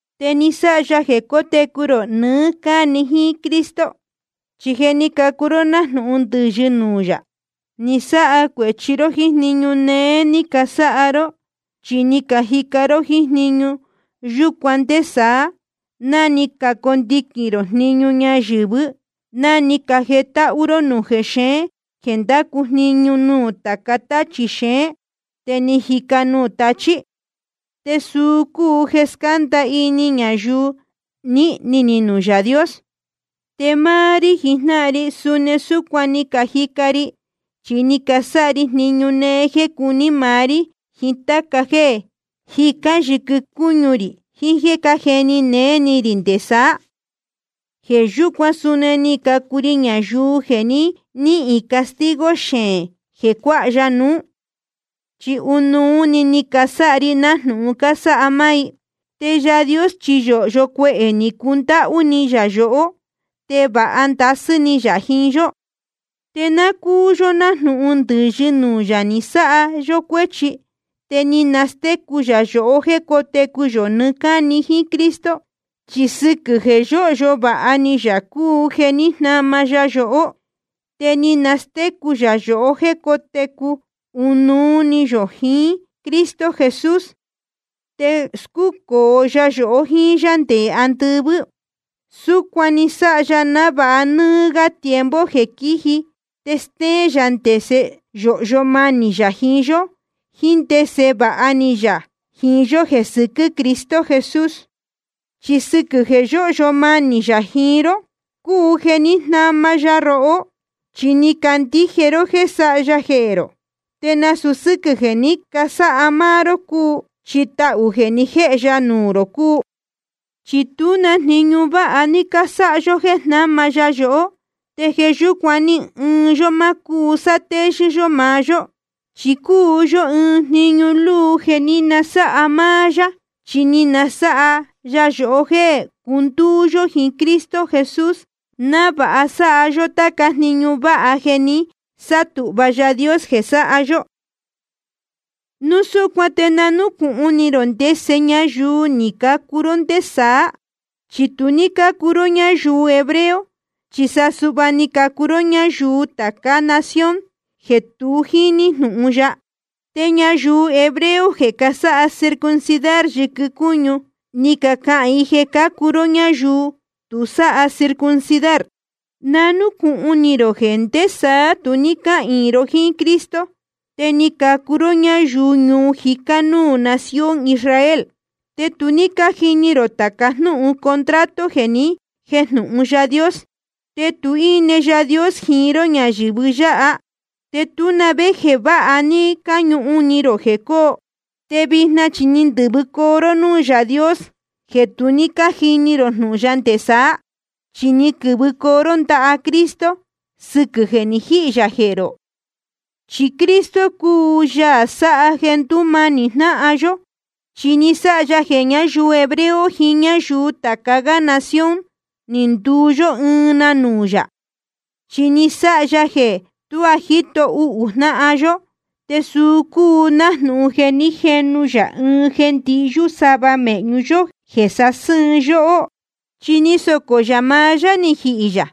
Te ni sáha ya jeē cotecu rō nɨɨ́ cáni jíín Cristo. Chi je ni cacuu ró nájnūhun ndɨ̄yɨ nuū yā, ni sáha cuēchi ró jíín jniñu néé ní casáha ró. Chi ni cajica ró jíín jniñu yúcuan nde saá, ná ni cacondiquīn rō jniñu ñayuu ñayɨ̄vɨ́, ná ni cajetáhú ró núū jexeén jeē ndácu jniñu nuū tāca táchī xeén, te jíca nuū tachí. Te suu cúu jeē scánda ini ñayuu nīhni ni nuū Yaā Dios. Te máá rí jijnáhan ri, suni súcuan ni cajica ri, chi ni casáha ri jniñu néé jéē cuní maá rí, jiín táca jéē jicán yɨquɨ cúñu rī, jiín jéē cájeni néé ni rī nde saá. Jeē yúcuan suni ni cacuu ri ñayuu jeē nihīn castigo xeēn jeē cuáha ya nuú, chi ɨnuú‑ni ni casáha ri nájnūhun cásáha máá i. Te Yaā Dios chi yōhyo cuehē ni cundáhú ni yā yohó, te vāha ndasɨ́ ni yā jiín yó. Te náa cúu yó nájnūhun ndɨ̄yɨ nuū yā ni sáha cuēchi yó, te ni nastécu yā yohó jéē cótecu yō nɨɨ́ cáni jíín Cristo. Chi sɨquɨ̄ jeē yóhyo vāha ni yā cúu jeē ní jnama ya yohó. Te ni nastécu yā yohó jéē cótecu ɨnuú yó jíín Cristo Jesús, te scúcōo ya yohó jíín yá nde andɨvɨ́. Súcuan ni sáha ya návāha nɨ́ɨ́ gá tiempo jeē quíji, te stéén yā ndese yōhyo manī yā jiín yó, jíín ndese vāha ni yā jiín yó jeē sɨquɨ́ Cristo Jesús. Chi sɨquɨ̄ jeē yóhyo manī yā jiín ró cúu jeē ní jnama ya rohó, chi ni cacandíje ró jéē sáha ya jehē rō. Te nasūu sɨ́quɨ̄ jeē ní casáha máá ró cúu, chi tahū jeē ni jéhe ya nuū rō cúu. Chi tú na jniñu váha ní cásáha yó jéē jnáma ya yohó, te jeē yúcuan ni ɨɨn yó ma cúu sátéyɨ́ yó maá yó. Chi cúu yó ɨɨn jniñu luu jeē ní nasáha máá yá, chi ni nasáha ya yohó jéē cundúú yó jiín Cristo Jesús, návāha sáha yó táca jniñu váha jeē jé ni sátūhva Yaā Dios jeē sáha yó. Núu súcuan te na núcūhun ni rō ndese ñayuu ni cacuu ró ndé saá. Chi tu ní cácuu ró ñáyuu hebreo, chi sa suhva ni cacuu ró ñáyuu tācá nación jeē tu jíní jnūhun ya. Te ñayuu hebreo jeē casáha circuncidar yɨquɨ cúñu, ni cacahān i jeē cácuu ró ñáyuu tu sáha circuncidar. Na núcūhun ni rō jeē ndé saá tu ní cáhīin ró jíín Cristo, te ni cacuu ró ñáyuu ñuu jicá núū nación Israel. Te tu ní cájini rō tāca jnúhun contrato jeē ni jéjnūhun Yaā Dios. Te tu ní íne Yaā Dios jiín ró ñayɨ̄vɨ yáha, te tú na vé jeē váha ní cáñuhun ni rō jeē cóo. Te vijna chi ni ndɨ̄vɨcoo ró núū Yaā Dios jeē tu ní cájini rō jnūhun ya nde saá, chi ni quɨ̄vɨcoo ró ndaha Cristo sɨquɨ̄ jeē ni jíhī yā jehē rō. Chi Cristo cúu Yaā sáha jeē ndúmanī jnáhan yó. Chi ni sáha ya jeē ñáyuu hebreo jiín ñáyuu tāca gá nación, ni nduu yó ɨɨn na nuū yā. Chi ni sáha ya jeē tuá jíto uhū jnáhan yó, te suu cúu nájnūhun jeē ní jenu ya ɨɨn jeē ndihyú sava mēhñu yó jeē sásɨ́ɨn yóhó. Chi ni socō yā maá yá ni jihī yā,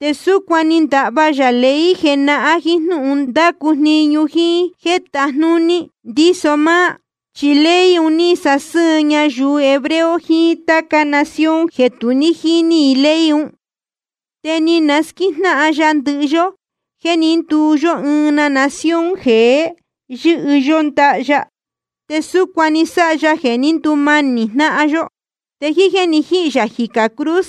te súcuan ni ndahva yā ley jenahán jíín jnúhun ndácu jniñu jíín jéē tajnúní ndíso máá. Chi ley un ní sásɨ́ɨn ñayuu hebreo jiín táca nación jeē tu ní jíní i ley un. Te ni nasquíjnáhan ya ndɨhɨ yó jéē ní nduu yó ɨɨn na nación jeé, yɨ́hɨ yó ndaha ya. Te súcuan ni sáha ya jeē ní ndumanī jnáhan yó. Te jíín jéē ni jíhī yā jicā cruz,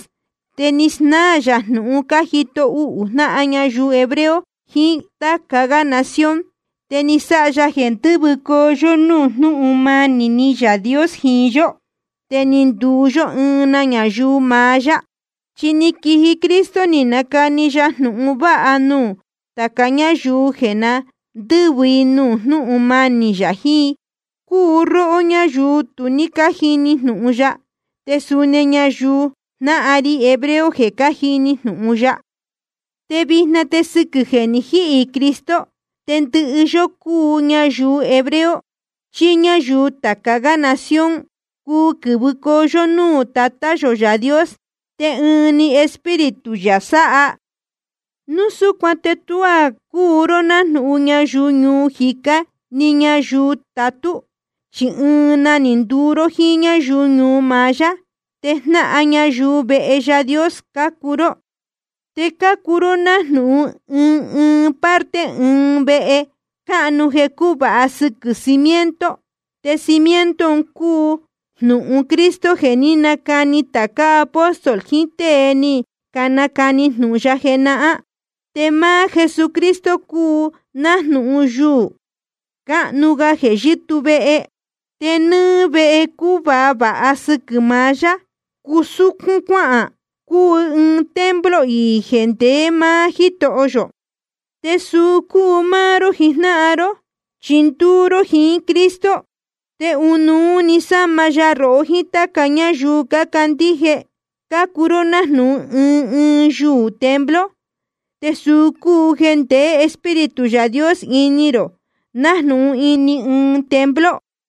te ni snáā yā jnūhun cájito uhū jnáhan ñayuu hebreo jiín táca gá nación. Te ni sáha ya jeē ndɨ́vɨcoo yó núū jnúhun manī Yaā Dios jiín yó, te ni nduu yó ɨɨn na ñayuu maá yá. Chi ni quiji Cristo ni nacani ya jnūhun vāha nuū tāca ñáyuu jeē na ndɨ́vɨ i nuū jnúhun manī yā jiín i, cúu róhó ñáyuu tu ní cájini jnūhun ya, te suni ñayuu jnáhan ri hebreo jeē cájini jnūhun ya. Te vijna te sɨquɨ̄ jeē ni jíhī Cristo, te ndɨhɨ yó, cúu ñayuu hebreo chí ñáyuu tāca gá nación, cuu quɨ̄vɨcoo yó núū Tatá yō Yaā Dios, te ɨɨn‑ni Espíritu yā sáha. Núu súcuan te tuá cúu ró nájnūhun ñayuu ñuu jicá ni ñayuu tatú, chi ɨɨn na ni nduu ró jíín ñáyuu ñuu maá yá. Te jnáhan ñayuu vehe Yaā Dios cácuu ró. Te cácuu ró nájnūhun ɨɨn ɨɨn parte ɨɨn vehe cáhnu jeē cúvāha sɨquɨ̄ cimiento, te cimiento un cúu jnūhun Cristo jeē ní canacani tācá apóstol jiín tée ni canacani jnūhun ya jenahán. Te máá Jesucristo cúu nájnūhun yuū cánuú gá jeē yɨ́tuu vehe. Te nɨ́ɨ́ vehe cúvāha vāha sɨquɨ̄ maá yá, cúsúcún cuáhān, cúu ɨɨn templo iī jeē ndeé maá Jítoho yō. Te suu cúu máá ró jijnáhan ró, chi ndúú ró jiín Cristo, te ɨnuú‑ni sáma ya rohó jiín táca ñáyuu cácandíje, cácuu ró nájnūhun ɨɨn ɨɨn yuū templo. Te suu cúu jeē ndeé Espíritu Yaā Dios ini rō nájnūhun ini ɨɨn templo.